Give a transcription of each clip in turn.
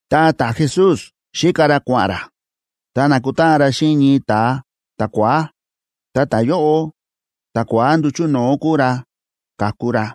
Ta ta̱Jesús xíka ra kua̱ꞌa̱n ra, ta na̱kutáꞌan ra xíꞌin ñii ta̱a ta̱kua̱á. Ta ta̱yóꞌo, ta̱kua̱á nduchu̱ no̱o̱ kúu ra ka̱ku ra.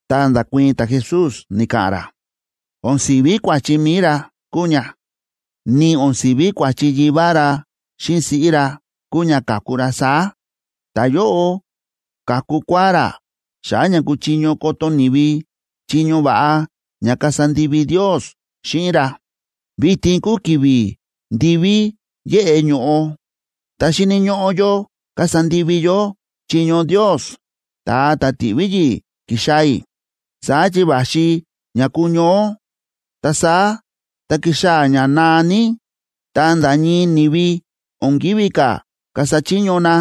Ta nda̱kuii̱n ta̱Jesús, ni̱ka̱ꞌa̱n ra: ―O̱n si̱ví kua̱chi mi̱i ra kúu ña, ni o̱n si̱ví kua̱chi yivá ra xíꞌin siꞌí ra kúu ña ka̱ku ra saá. Ta̱yóꞌo ka̱ku kua̱á ra xa̱ꞌa̱ ña kuchiño koto ni̱vi chiño va̱ꞌa ña kasa ndivi Ndios xíꞌin ra. Vitin kúu ki̱vi̱ ndiví yéꞌe ño̱ꞌo, ta xíni̱ ñóꞌó yó kasa ndivi yó chiño Ndios, ta̱a ta̱ ti̱ꞌví yi̱ꞌi̱ kixaa̱ i̱. Saá chi va̱xi ña kuñoó, ta saá tá kixaa̱ ña naa ní, ta nda̱ ñii ni̱vi o̱n kívi ka̱ kasa chiño na.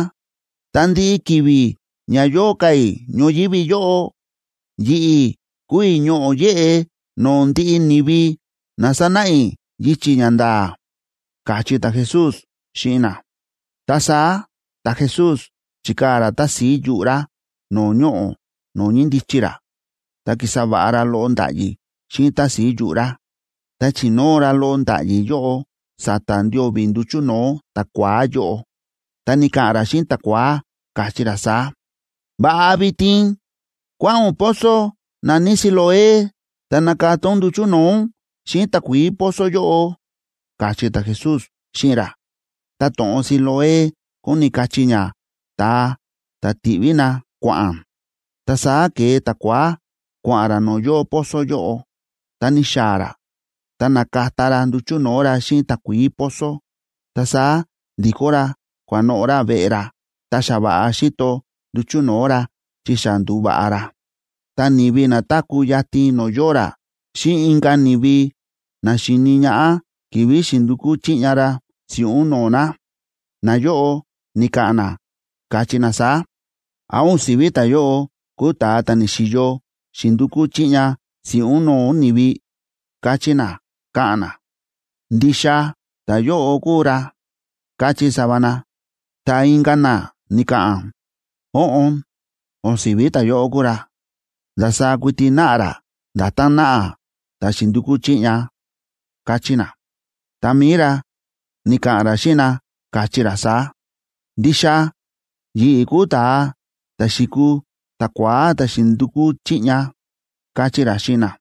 Ta ndiꞌi ki̱vi̱ ña yóo ka̱ i̱ ñoyívi yóꞌo, yi̱ꞌi̱ kúu i̱ ñoꞌo̱ yéꞌe no̱o̱ ndiꞌi ni̱vi ná sanáꞌa i̱ yichi̱ ña nda̱a̱ ―káchí ta̱Jesús xíꞌin na. Ta saá ta̱Jesús, chi̱kaa̱ ra tási̱i yuꞌu̱ ra no̱o̱ ñoꞌo̱ no̱o̱ ñíndichi ra, ta ki̱sa va̱ꞌa ra loꞌo nda̱ꞌyi̱ xíꞌin tási̱i yuꞌu̱ ra, ta chi̱nóo ra loꞌo nda̱ꞌyi̱ yóꞌo sa̱ta̱ ndio̱vi̱ nduchu̱ no̱o̱ ta̱kua̱á yóꞌo, ta ni̱ka̱ꞌa̱n ra xíꞌin ta̱kua̱á, káchí ra saá: ―Va̱ꞌa vitin kua̱ꞌa̱n ún pozo na̱ní Siloé, ta nakata ún nduchu̱ no̱o̱ ún xíꞌin takuií pozo yóꞌo ―káchí ta̱Jesús xíꞌin ra. (Ta to̱ꞌon Siloé kóni kachí ña: Ta̱a ta̱ ti̱ꞌví na kua̱ꞌa̱n.) Ta saá ke̱e ta̱kua̱á kua̱ꞌa̱n ra no̱o̱ yóo pozo yóꞌo, ta ni̱xaa̱ ra, ta na̱kata ra nduchu̱ no̱o̱ ra xíꞌin takuií pozo. Ta saá ndi̱kó ra kua̱noꞌo̱ ra veꞌe ra, ta xa va̱ꞌa xíto nduchu̱ no̱o̱ ra, chi xa ndu̱va̱ꞌa ra. Ta ni̱vi na táku̱ yatin no̱o̱ yóo ra, xíꞌin inka̱ ni̱vi na xi̱ni ñaꞌá ki̱vi̱ xi̱ndukú chiꞌña ra si̱ꞌún no̱o̱ na, nayóꞌo ni̱ka̱ꞌa̱n na, káchí na saá: ―¿Án o̱n si̱ví ta̱yóꞌo kúu ta̱a ta̱ ni̱xi̱yo xi̱ndukú chiꞌña si̱ꞌún no̱o̱ ni̱vi? ―káchí na, káꞌa̱n na. ―Ndixa ta̱yóꞌo kúu ra ―káchí sava na. Ta inka̱ na ni̱ka̱ꞌa̱n: ―Óꞌon, o̱n si̱ví ta̱yóꞌo kúu ra, ndasaá kuiti náꞌa ra nda̱tán náꞌa ta̱ xi̱ndukú chiꞌña ―káchí na. Ta mi̱i ra, ni̱ka̱ꞌa̱n ra xíꞌin na, káchí ra saá: ―Ndixa yi̱ꞌi̱ kúu ta̱a ta̱ xi̱kuu ta̱kua̱á ta̱ xi̱ndukú chiꞌña ―káchí ra xíꞌin na.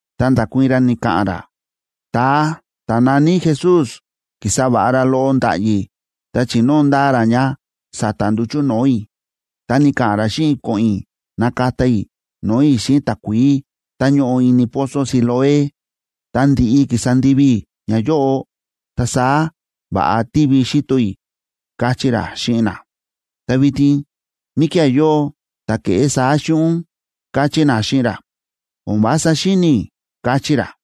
Ta nda̱kuii̱n ra, ni̱ka̱ꞌa̱n ra: ―Ta̱a ta̱ na̱ní Jesús ki̱sa va̱ꞌa ra loꞌo nda̱ꞌyi̱ ta chi̱nóo ndaa ra ña sa̱ta̱ nduchu̱ no̱o̱ i̱. Ta ni̱ka̱ꞌa̱n ra xíꞌin i̱ ko̱ꞌo̱n i̱ nakata i̱ no̱o̱ i̱ xíꞌin takuií tá ñóꞌo ini pozo Siloé. Tá ndi̱ꞌi ki̱sa ndivi i̱ ñayóꞌo, ta saá va̱ꞌa tívi xíto i̱ ―káchí ra xíꞌin na. ―Ta vitin, ¿míkía̱ yóo ta̱ ke̱ꞌé saá xíꞌin ún? ―káchí na xíꞌin ra. ―O̱n vása xíni̱ i̱ ―káchí ra.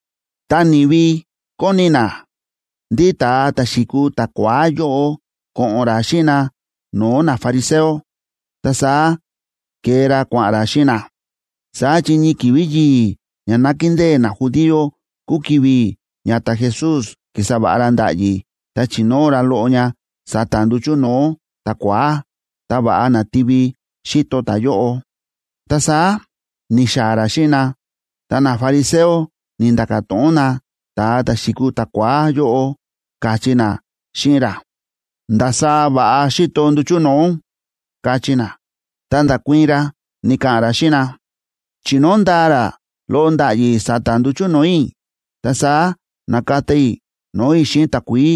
Ta ni̱vi kóni na ndí ta̱a ta̱ xi̱kuu ta̱kua̱á yóꞌo ko̱ꞌo̱n ra xíꞌin na no̱o̱ nafariseo, ta saá ke̱e ra kua̱ꞌa̱n ra xíꞌin na. Saá chi ñii ki̱vi̱ yi̱i̱ ña nákindée najudío kúu ki̱vi̱ ña ta̱Jesús ki̱sa va̱ꞌa ra nda̱ꞌyi̱ ta chi̱nóo ra loꞌo ña sa̱ta̱ nduchu̱ no̱o̱ ta̱kua̱á, ta va̱ꞌa na̱tivi xíto ta̱yóꞌo. Ta saá ni̱xaa̱ ra xíꞌin na, ta nafariseo ni̱nda̱ka̱ to̱ꞌon na ta̱a ta̱ xi̱kuu ta̱kua̱á yóꞌo, káchí na xíꞌin ra: ―¿Ndasaá va̱ꞌa xíto nduchu̱ no̱o̱ ún? ―káchí na. Ta nda̱kuii̱n ra, ni̱ka̱ꞌa̱n ra xíꞌin na: ―Chi̱nóo ndaa ra loꞌo nda̱ꞌyi̱ sa̱ta̱ nduchu̱ no̱o̱ i̱, ta saá na̱kata i̱ no̱o̱ i̱ xíꞌin takuií,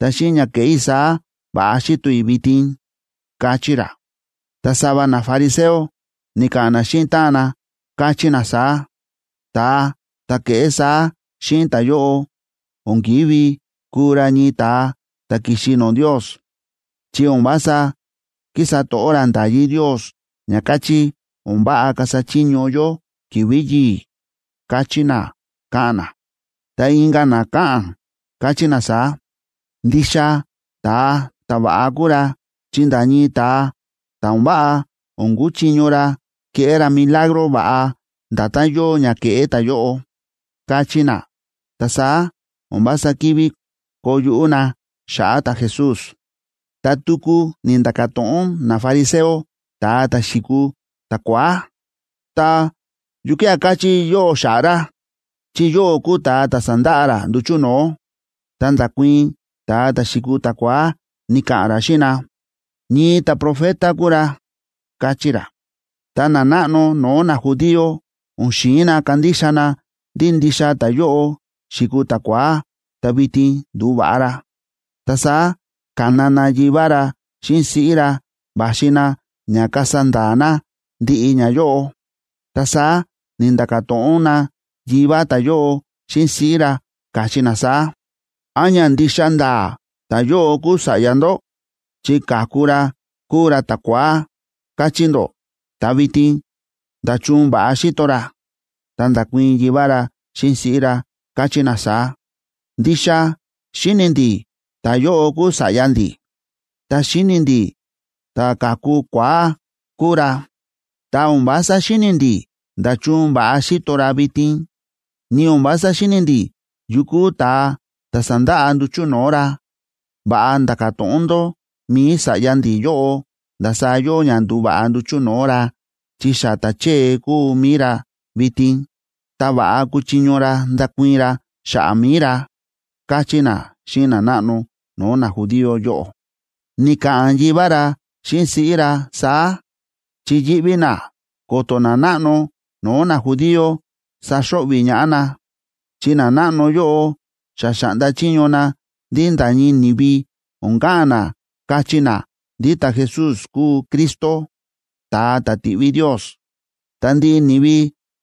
ta xíꞌin ña ke̱ꞌé i̱ saá va̱ꞌa xíto i̱ vitin ―káchí ra. Ta sava nafariseo ni̱ka̱ꞌa̱n na xíꞌin táꞌan na, káchí na saá: ―Ta̱a ta̱ ke̱ꞌé saá xíꞌin ta̱yóꞌo o̱n ki̱ví kuu ra ñii ta̱a ta̱ ki̱xi no̱o̱ Ndios, chi o̱n vása kísa to̱ꞌó ra nda̱yí Ndios ña káchí o̱n váꞌa kasa chiño yó ki̱vi̱ yi̱i̱ ―káchí na, káꞌa̱n na. Ta inka̱ na káꞌa̱n, káchí na saá: ―Ndixa ta̱a ta̱va̱ꞌa kúu ra chi nda̱ ñii ta̱a ta̱ o̱n váꞌa o̱n kúchiño ra keꞌé ra milagro va̱ꞌa nda̱tán yóo ña kéꞌé ta̱yóꞌo ―káchí na. Ta saá o̱n vása kivi koo yuꞌú na xa̱ꞌa̱ ta̱Jesús. Ta tuku ni̱nda̱ka̱ to̱ꞌon nafariseo ta̱a ta̱ xi̱kuu ta̱kua̱á: ―Ta, ¿yukía̱ káchí yóꞌó xa̱ꞌa̱ ra? Chi yóꞌó kúu ta̱a ta̱ sa̱nda̱ꞌa ra nduchu̱ no̱o̱. Ta nda̱kuii̱n ta̱a ta̱ xi̱kuu ta̱kua̱á, ni̱ka̱ꞌa̱n ra xíꞌin na: ―Ñii ta̱profeta kúu ra ―káchí ra. Ta nanáꞌno no̱o̱ najudío o̱n xi̱in na kandixa na ndí ndixa ta̱yóꞌo xi̱kuu ta̱kua̱á ta vitin ndu̱va̱ꞌa ra. Ta saá ka̱na na yivá ra xíꞌin siꞌí ra va̱xi na ña kasa nda̱a̱ na ndiꞌi ñayóꞌo. Ta saá ni̱nda̱ka̱ to̱ꞌon na yivá ta̱yóꞌo xíꞌin siꞌí ra, káchí na saá: ―¿Án ña ndixa nda̱a̱ ta̱yóꞌo kúu sa̱ꞌya ndó? Chi ka̱ku ra kúu ra ta̱kua̱á, káchí ndó, ta vitin, ¿nda̱chun va̱ꞌa xíto ra? Ta nda̱kuii̱n yivá ra xíꞌin siꞌí ra, káchí na saá: ―Ndixa xíni̱ ndi̱ ta̱yóꞌo kúu sa̱ꞌya ndi̱, ta xíni̱ ndi̱ ta̱ ka̱ku kua̱á kúu ra. Ta o̱n vása xíni̱ ndi̱ nda̱chun va̱ꞌa xíto ra vitin, ni o̱n vása xíni̱ ndi̱ yu kúu ta̱a ta̱ sa̱ndaꞌa nduchu̱ no̱o̱ ra. Va̱ꞌa nda̱ka̱ to̱ꞌon ndó mi̱i sa̱ꞌya ndi̱ yóꞌo ndasaá yóo ña ndu̱va̱ꞌa nduchu̱ no̱o̱ ra, chi xa ta̱chée kúu mi̱i ra vitin, ta va̱ꞌa kúchiño ra ndakuii̱n ra xa̱ꞌa̱ mi̱i ra ―káchí na xíꞌin nanáꞌno no̱o̱ najudío yóꞌo. Ni̱ka̱ꞌa̱n yivá ra xíꞌin siꞌí ra saá, chi yíꞌví na ko̱to̱ nanáꞌno no̱o̱ najudío saxo̱ꞌvi̱ ñaꞌá na, chi nanáꞌno yóꞌo xa xa̱ꞌnda chiño na ndí nda̱ ñii ni̱vi o̱n ka̱ꞌa̱n na kachí na ndí ta̱Jesús kúu Cristo, ta̱a ta̱ ti̱ꞌví Ndios. Ta ndiꞌi ni̱vi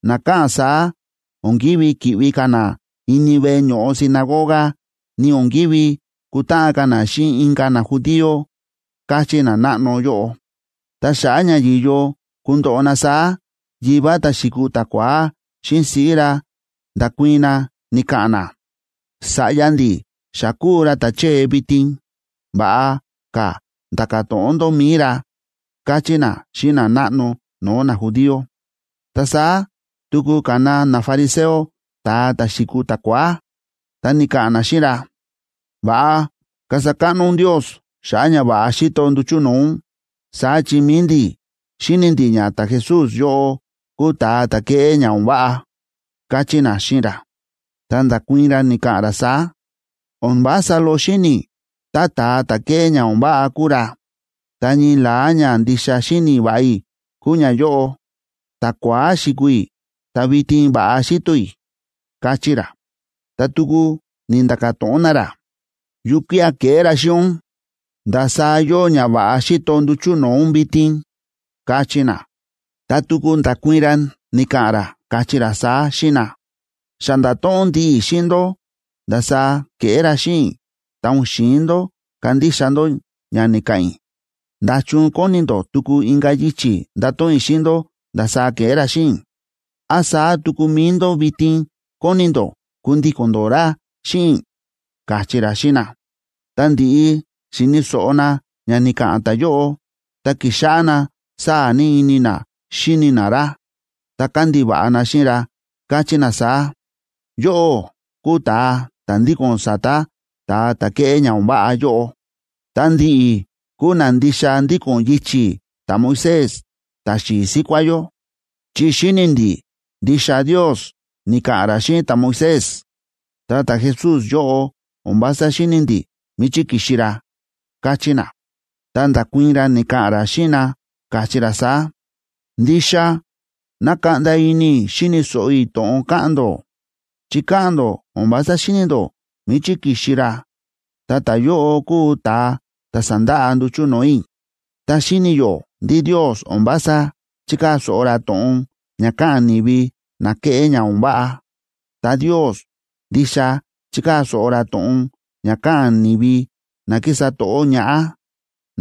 na káꞌa̱n saá o̱n kívi ki̱ꞌvi ka̱ na ini veꞌe ño̱ꞌo sinagoga, ni o̱n kívi kutáꞌan ka̱ na xíꞌin inka̱ najudío, káchí nanáꞌno yóꞌo. Ta xa̱ꞌa̱ ña yi̱yo kundoꞌo na saá, yivá ta̱ xi̱kuu ta̱kua̱á xíꞌin siꞌí ra nda̱kuii̱n na ni̱ka̱ꞌa̱n na: “Sa̱ꞌya ndi̱ xa kúu ra ta̱chée vitin, va̱ꞌa ka̱ nda̱ka̱ to̱ꞌon ndó mi̱i ra”, káchí na xíꞌin nanáꞌno no̱o̱ najudío. Ta saá tuku ka̱na nafariseo ta̱a ta̱ xi̱kuu ta̱kua̱á, ta ni̱ka̱ꞌa̱n na xíꞌin ra: ―Va̱ꞌa kasa káꞌno ún Ndios xa̱ꞌa̱ ña va̱ꞌa xíto nduchu̱ no̱o̱ ún. Saá chi mi̱i ndi̱, xíni̱ ndi̱ ña ta̱Jesús yóꞌo kúu ta̱a ta̱ kéꞌé ña o̱n váꞌa ―káchí na xíꞌin ra. Ta nda̱kuii̱n ra, ni̱ka̱ꞌa̱n ra saá: ―O̱n vása loꞌo xíni̱ i̱ tá ta̱a ta̱ kéꞌé ña o̱n váꞌa kúu ra. Ta ñii la̱á ñandixa xíni̱ va̱ꞌa i̱ kúu ñayóꞌo: ta̱kua̱á xi̱kuu i̱, ta vitin va̱ꞌa xíto i̱ ―káchí ra. Ta tuku ni̱nda̱ka̱ to̱ꞌon na ra: ―¿Yukía̱ ke̱ꞌé ra xíꞌin ún? ¿Ndasaá yóo ña va̱ꞌa xíto nduchu̱ no̱o̱ ún vitin? ―káchí na. Ta tuku nda̱kuii̱n ra, ni̱ka̱ꞌa̱n ra, káchí ra saá xíꞌin na: ―Xa nda̱to̱ꞌon ndiꞌi i̱ xíꞌin ndó ndasaá ke̱ꞌé ra xíꞌin i̱, ta o̱n xi̱in ndó kandixa ndó ña ni̱ka̱ꞌa̱n i̱. ¿Nda̱chun kóni ndó tuku inka̱ yichi̱ ndato̱ꞌon i̱ xíꞌin ndó ndasaá ke̱ꞌé ra xíꞌin i̱? ¿Án saá tuku mi̱i ndó vitin kóni ndó kundíko̱n ndó ra xíꞌin i̱? ―káchí ra xíꞌin na. Tá ndi̱ꞌi xi̱ni̱ so̱ꞌo na ña ni̱ka̱ꞌa̱n ta̱yóꞌo, ta ki̱xáꞌá na sáa̱ ní ini na xíni na ra, ta kándiva̱ꞌa na xíꞌin ra, káchí na saá: ―Yóꞌó kúu ta̱a ta̱ ndíko̱n sa̱ta̱ ta̱a ta̱ kéꞌé ña o̱n váꞌa yóꞌo. Ta ndi̱ꞌi̱ kúu na ndixa ndíko̱n yichi̱ ta̱Moisés, ta̱xi̱i̱ síkuá yó. Chi xíni̱ ndi̱ ndixa Ndios ni̱ka̱ꞌa̱n ra xíꞌin ta̱Moisés, ta ta̱Jesús yóꞌo, o̱n vása xíni̱ ndi̱ míchí ki̱xi ra ―káchí na. Ta nda̱kuii̱n ra, ni̱ka̱ꞌa̱n ra xíꞌin na, káchí ra saá: ―Ndixa nákaꞌnda ini i̱ xi̱ni̱ so̱ꞌo i̱ to̱ꞌon káꞌa̱n ndó, chi káꞌa̱n ndó o̱n vása xíni̱ ndó míchí ki̱xi ra, ta ta̱yóꞌo kúu ta̱a ta̱ sa̱ndaꞌa nduchu̱ no̱o̱ i̱. Ta xíni̱ yó ndí Ndios o̱n vása chíkaa̱ so̱ꞌo ra to̱ꞌon ña káꞌa̱n ni̱vi na kéꞌé ña o̱n váꞌa. Ta Ndios ndixa chíkaa̱ so̱ꞌo ra to̱ꞌon ña káꞌa̱n ni̱vi na kísa to̱ꞌó ñaꞌá,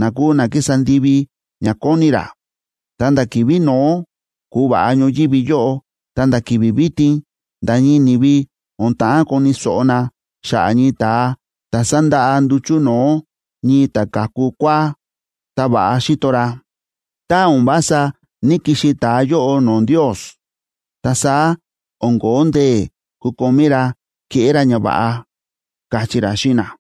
na kúu na kísa ndivi ña kóni ra. Ta nda̱ ki̱vi̱ no̱ó ku̱va̱ꞌa ñoyívi yóꞌo, ta̱nda̱ ki̱vi̱ vitin nda̱ ñii ni̱vi o̱n ta̱ꞌán koni̱ so̱ꞌo na xa̱ꞌa̱ ñii ta̱a ta̱ sa̱ndaꞌa nduchu̱ no̱o̱ ñii ta̱ ka̱ku kua̱á, ta va̱ꞌa xíto ra. Tá o̱n vása ní‑kixi ta̱a yóꞌo no̱o̱ Ndios, ta saá o̱n kóo ndee̱ kukomí ra keꞌé ra ñava̱ꞌa ―káchí ra xíꞌin na.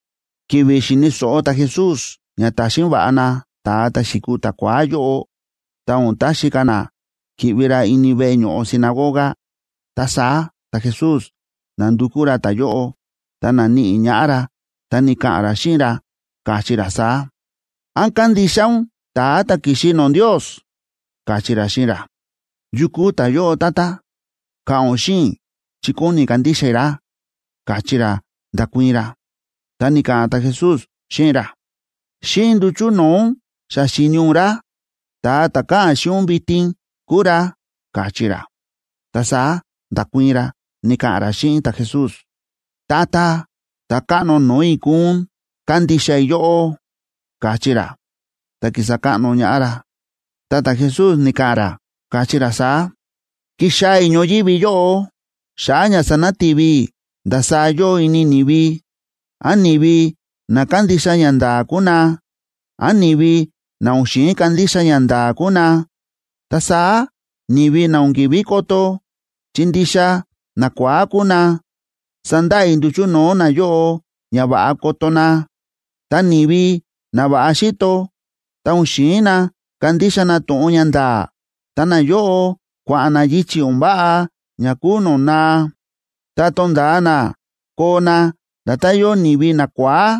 Ki̱vi̱ xi̱ni̱ so̱ꞌo ta̱Jesús ña ta̱xin va̱ꞌa na ta̱a ta̱ xi̱kuu ta̱kua̱á yóꞌo, ta o̱n taxi ka̱ na ki̱ꞌvi ra ini veꞌe ño̱ꞌo sinagoga, ta saá ta̱Jesús na̱ndukú ra ta̱yóꞌo, ta na̱níꞌi ñaꞌá ra, ta ni̱ka̱ꞌa̱n ra xíꞌin ra, káchí ra saá: ―¿Án kándixa ún ta̱a ta̱ ki̱xi no̱o̱ Ndios? ―káchí ra xíꞌin ra. ―¿Yu kúu ta̱yóꞌo, Tata? Ka̱ꞌa̱n ún xíꞌin i̱, chi kóni kandixa i̱ ra ―káchí ra, nda̱kuii̱n ra. Ta ni̱ka̱ꞌa̱n ta̱Jesús xíꞌin ra: ―Xíꞌin nduchu̱ no̱o̱ ún xa xi̱ni ún ra, ta̱a ta̱ káꞌa̱n xíꞌin ún vitin kúu ra ―káchí ra. Ta saá nda̱kuii̱n ra, ni̱ka̱ꞌa̱n ra xíꞌin ta̱Jesús: ―Tata, Ta̱káꞌno no̱o̱ i̱ kúu ún, kándixa i̱ yóꞌó ―káchí ra, ta ki̱sa káꞌno ñaꞌá ra. Ta ta̱Jesús ni̱ka̱ꞌa̱n ra, káchí ra saá: ―Ki̱xaa̱ i̱ ñoyívi yóꞌo xa̱ꞌa̱ ña sanati̱vi i̱ ndasaá yóo ini ni̱vi, án ni̱vi na kándixa ñanda̱a̱ kúu na, án ni̱vi na o̱n xi̱in kandixa ñanda̱a̱ kúu na. Ta saá ni̱vi na o̱n ki̱ví koto, chi ndixa nakua̱á kúu na, sandaꞌa i̱ nduchu̱ no̱o̱ nayóꞌo ña va̱ꞌa koto na. Ta ni̱vi na va̱ꞌa xíto, tá o̱n xi̱in na kandixa na to̱ꞌon ña nda̱a̱, ta nayóꞌo kua̱ꞌa̱n na yichi̱ o̱n váꞌa ña kúu no̱o̱ naa, ta tonda̱a na koo na nda̱tán yóo ni̱vi nakua̱á.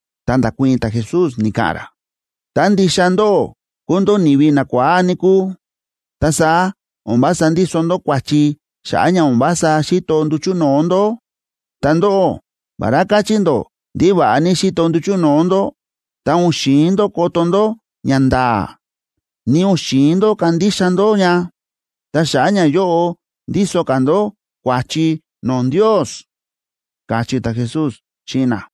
Ta nda̱kuii̱n ta̱Jesús, ni̱ka̱ꞌa̱n ra: ―Tá ndixa ndóꞌó kúu ndó ni̱vi nakua̱á, níkúu, ta saá o̱n vása ndíso ndó kua̱chi xa̱ꞌa̱ ña o̱n vása xíto nduchu̱ no̱o̱ ndó. Ta ndóꞌó, vará káchí ndó ndí va̱ꞌa ní xíto nduchu̱ no̱o̱ ndó, ta o̱n xi̱in ndó koto ndó ñanda̱a̱, ni o̱n xi̱in ndó kandixa ndó ña. Ta xa̱ꞌa̱ ñayóꞌo, ndíso ka̱ ndó kua̱chi no̱o̱ Ndios ―káchí ta̱Jesús xíꞌin na.